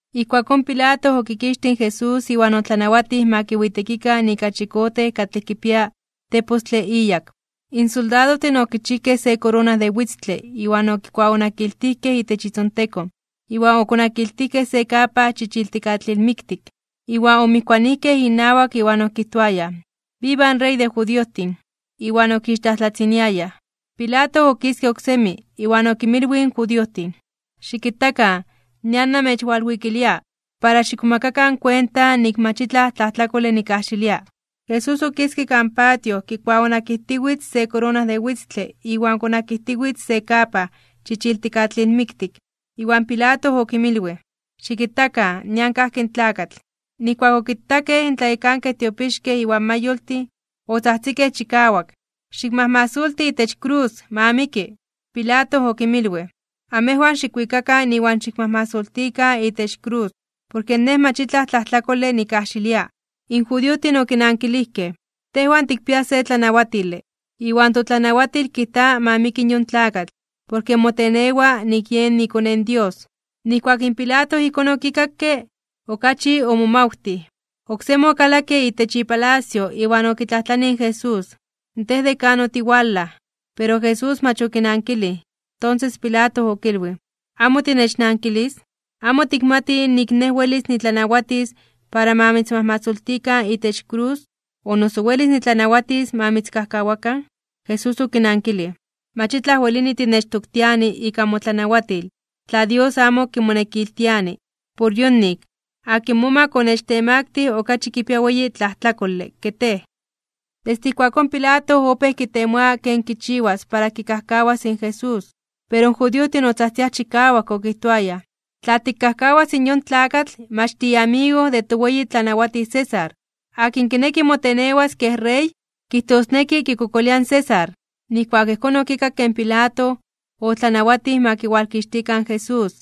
Ijkuakón Pilato okikixtij in Jesús iwan otlanawatij ma kiwitekikan ika chikote katlej kipia tepostle iyak. In soldadojtin okichijkej se korona de witztle iwan okikuaonakiltijkej itech itzontekon, iwan okonakiltijkej se kapa chichiltikatlilmiktik. Iwan omijkuanijkej inawak iwan okijtoayaj: ―¡Viva in Rey de judiojtin! Iwan okixtlajtlatziniayaj. Pilato okiske oksemi, iwan okimilwij in judiojtin: ―Xikitakan, nian namechwalwikilia, para xikmomakakan kuenta nik mach itlaj tlajtlakole nikkajxilia. Jesús okiske kan patio kikuaonakijtiwitz se korona de witztle iwan konakijtiwitz se kapa chichiltikatlilmiktik. Iwan Pilato okinmilwij: ―Xikitakan, nian kajki in tlakatl. Nijkuak okitakej in tlayekankej tiopixkej iwan mayoltin, otzajtzikej chikawak: ―¡Xikmajmasolti itech krus! ¡Ma miki! Pilato okinmilwij: ―Amejwan xikwikakan iwan xikmajmasoltikan itech krus, porke nej mach itlaj tlajtlakole nikkajxilia. In judiojtin okinankilijkej: ―Tejwan tikpiaj se tlanawatile, iwan totlanawatil kijta ma miki in yon tlakatl, porke motenewa nik yen iKone in Dios. Nijkuak in Pilato ijkón okikakke, okachi omomawtij. Oksemi okalakke itech ipalacio iwan okitlajtlanij in Jesús: ―¿Tej de kan otiwalaj? Pero in Jesús mach okinankilij. Tonses in Pilato okilwij: ―¿Amo tinechnankilis? ¿Amo tikmati nik nej welis nitlanawatis para ma mitzmajmasoltikan itech krus, o noso welis nitlanawatis ma mitzkajkawakan? Jesús okinankilij: ―Mach itlaj welini tinechtoktiani ika motlanawatil, tla Dios amo kimonekiltiani. Por yonik, akin momak onechtemaktij (onechtemaktilij) okachi kipia weyi tlajtlakole ke tej. Desde ijkuakón in Pilato opéj kitemoa ken kichiwas para kikajkawas in Jesús. Pero in judiojtin otzajtziaj chikawak okijtoayaj: ―¡Tla tikkajkawas in yon tlakatl, mach tiiamigo de yen toweyi tlanawatij César! ¡Akin kineki motenewas kej rey, kijtosneki kikokolia in César! Nijkuak ijkón okikakke in Pilato, otlanawatij ma kiwalkixtikan in Jesús,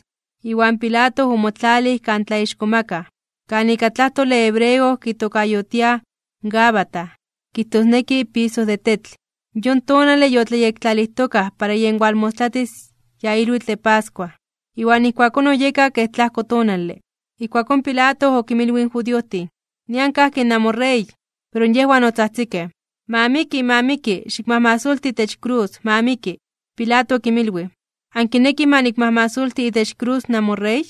iwan Pilato omotlalij kan tlaixkomakaj (tlatzonmanaj), kan ika tlajtole hebreo kitokayotiaj Gabata, kijtosneki Piso de Tetl. Yon tonale yotlayektlalijtokaj para yen walmostlatis ya ilwitl de pascua, iwan ijkuakón oyeka kej tlajko tonale. Ijkuakón Pilato okinmilwij in judiojtin: ―¡Nian kajki namoRey! Pero yejwan otzajtzikej: ―¡Ma miki! ¡Ma miki! ¡Xikmajmasoltikan itech krus! ¡Ma miki! Pilato okinmilwij: ―¿Ankinekij ma nikmajmasolti itech krus namoRey?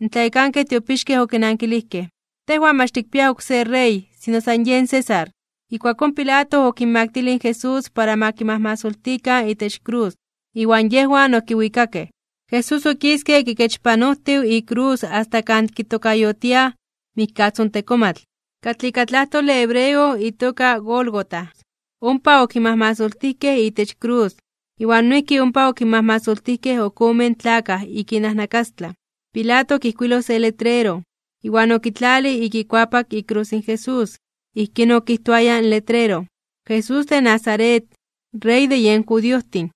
In tlayekankej tiopixkej okinankilijkej: ―¡Tejwan mach tikpiaj oksé rey, sino san yen César! Ijkuakón Pilato okinmaktilij in Jesús para ma kimajmasoltikan itech krus, iwan yejwan okiwikakej. Jesús okiske kikechpanojtiw ikrus asta kan kitokayotiaj Mikkatzontekomatl, katlej ika tlajtole hebreo itoka Gólgota. Ompa okimajmasoltijkej itech krus, iwan noijki ompa okinmajmasoltijkej ok omen tlakaj ik inajnakastlan. Pilato okijkuiloj se letrero, iwan okitlalij ik ikuapak ikrus in Jesús. Ijkín okijtoaya in letrero: “Jesús de Nazaret, Rey de yen judiojtin.”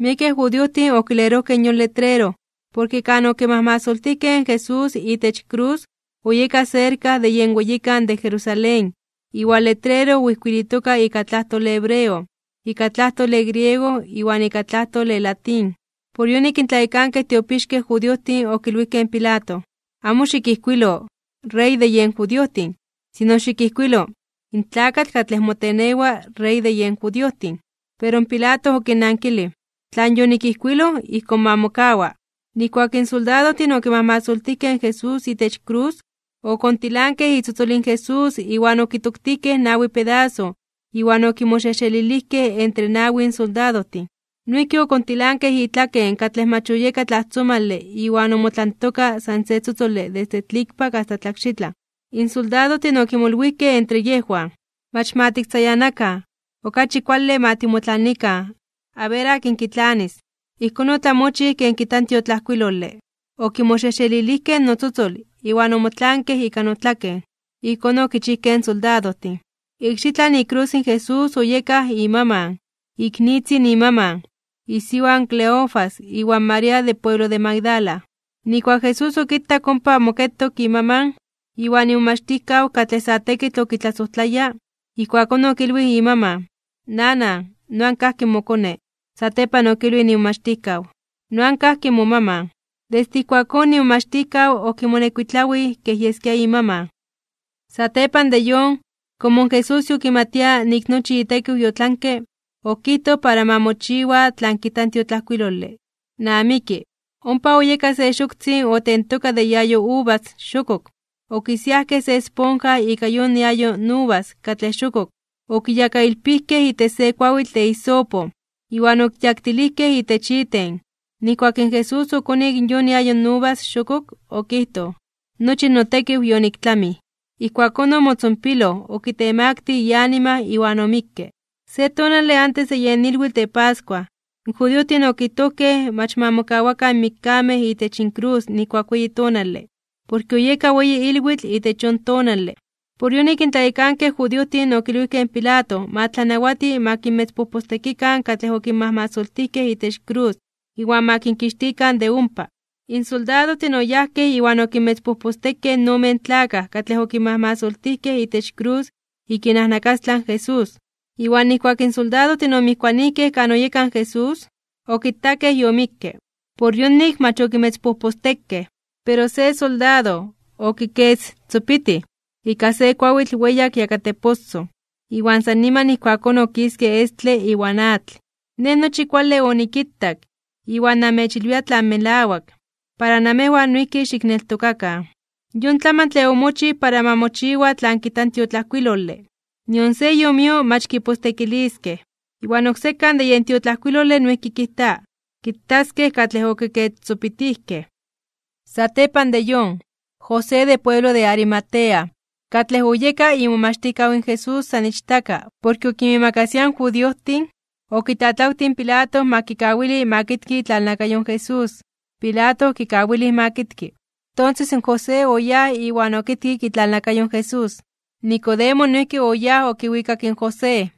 Miekej judiojtin okilerojkej yon letrero, porke kan okimajmasoltijkej in Jesús itech krus oyeka serka de yen weyikan de Jerusalén, iwan letrero oijkuilitoka ika tlajtole hebreo, ika tlajtole griego iwan ika tlajtole latín. Por yonik in tlayekankej tiopixkej judiojtin okilwijkej in Pilato: ―Amo xikijkuilo, “Rey de yen judiojtin”; sino xikijkuilo “In tlakatl katlej motenewa Rey de yen judiojtin.” Pero in Pilato okinnankilij: ―Tlan yonikijkuiloj, ijkón ma mokawa. Nijkuak in soldadojtin okimajmasoltijkej in Jesús itech krus, okontilankej itzotzol in Jesús iwan okitoktijkej nawi pedaso iwan okimoxejxelilijkej entre nawin soldadojtin. Noijki okontilankej itlaken katlej mach oyeka tlajtzomale iwan omotlantoka san se tzotzole desde tlikpak asta tlakxitlan. In soldadojtin okimolwijkej entre yejwan: ―Mach ma tiktzayanakan, okachi kuale ma timotlanikan, aber akin kitlanis. Ijkón otlamochij ken kijta in tiotlajkuilole: “Okimoxejxelilijkej notzotzol, iwan omotlaankej ika notlaken.” Ijkón okichijkej in soldadojtin. Ikxitlan ikrus in Jesús oyekaj imaman, iknitzin imaman, isiwa in Cleofas iwan María de pueblo de Magdala. Nijkuak in Jesús okitak ompa moketok imaman, iwan imomachtijkaw katlej sa tekitl okitlasojtlaya, ijkuakón okilwij imaman: ―Nanan, noan kajki mokone. Satepan okilwij imomachtijkaw: ―Noan kajki momaman. Desde ijkuakón imomachtijkaw okimonekuitlawij kej yeskia imaman. Satepan de yon, komo in Jesús yokimatia nik nochi itekiw yotlanke, okijtoj para ma mochiwa tlan kijta in tiotlajkuilole: ―¡Namiki! Ompa oyeka se xoktzin otentoka de iayo uvas xokok. Okisiajkej se esponja ika yon iayo uvas katlej xokok, okiyakailpijkej itech se kuawitl de hisopo, iwan okiyaktilijkej itech iten. Nijkuak in Jesús okonik yon iayo uvas xokok, okijtoj: ―Nochi notekiw yoniktlamij. Ijkuakón omotzonpiloj, okitemaktij (okitemaktilij) ianima iwan omikke. Se tonale antes de yen ilwitl de pascua, in judiojtin okijtojkej mach ma mokawakan in mikkamej itech inkrus nijkuak weyi tonale, porke oyeka weyi ilwitl itech yon tonale. Por yonik in tlayekankej judiojtin okilwijkej in Pilato ma tlanawati ma kinmetzpojpostekikan katlej okinmajmasoltijkej itech krus iwan ma kinkixtikan de ompa. In soldadojtin oyajkej iwan okinmetzpojpostekej in omen tlakaj katlej okinmajmasoltijkej itech krus ik inajnakastlan in Jesús. Iwan nijkuak in soldadojtin omijkuanijkej kan oyeka in Jesús, okitakej yomikke. Por yonik mach okimetzpojpostekej. Pero se soldado, okikestzopitij ika se kuawitl weyak yakateposoj, iwan san niman ijkuakón okiske estle iwan atl. Nej nochi kuale onikitak, iwan namechilwia tlan melawak, para namejwan noijki xikneltokakan. Yon tlamantle omochij para ma mochiwa tlan kijta in tiotlajkuilole: “Nion se iomio mach kipostekiliskej.” Iwan oksekan de yen tiotlajkuilole noijki kijta: “Kitaskej katlej okikestzopitijkej.” Satepan de yon, José de pueblo de Arimatea, katlej oyeka imomachtijkaw in Jesús san ichtaka porke okinmiimakasia in judiojtin, okitlatlawtij in Pilato ma kikawili ma kitki itlalnakayo in Jesús. Pilato okikawilij ma kitki. Tonses in José oyáj iwan okitkik itlalnakayo in Jesús. Nicodemo noijki oyáj okiwikak in José,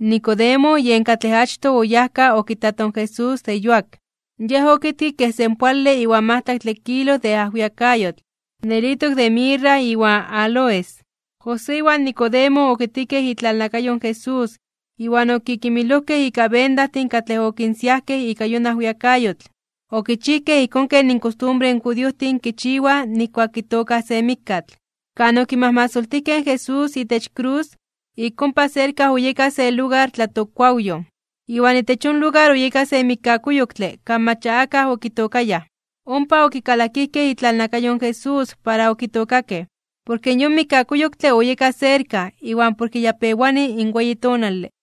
Nicodemo yen katlej achtoj oyajka okitato in Jesús de yuak. Yej okitkik kej senpoale iwan majtlaktle kilo de ajwiakayotl, nelitok de mirra iwan áloes. José iwan Nicodemo okitkikej itlalnakayo in Jesús iwan okikimilojkej ika bendajtin katlej okinsiajkej ika yon ajwiakayotl. Okichijkej ijkón ken inkostumbre in judiojtin kichiwaj nijkuak kitookaj se mikkatl. Kan okimajmasoltijkej in Jesús itech krus, ik ompa serka oyeka se lugar tlatokkuawyoj, iwan itech yon lugar oyeka se mikkakuyoktle kan mach ya akaj okitookayaj. Ompa okikalakijkej itlalnakayo in Jesús para okitookakej, porke yon mikkakuyoktle oyeka serka iwan porke ya pewani in weyi tonale.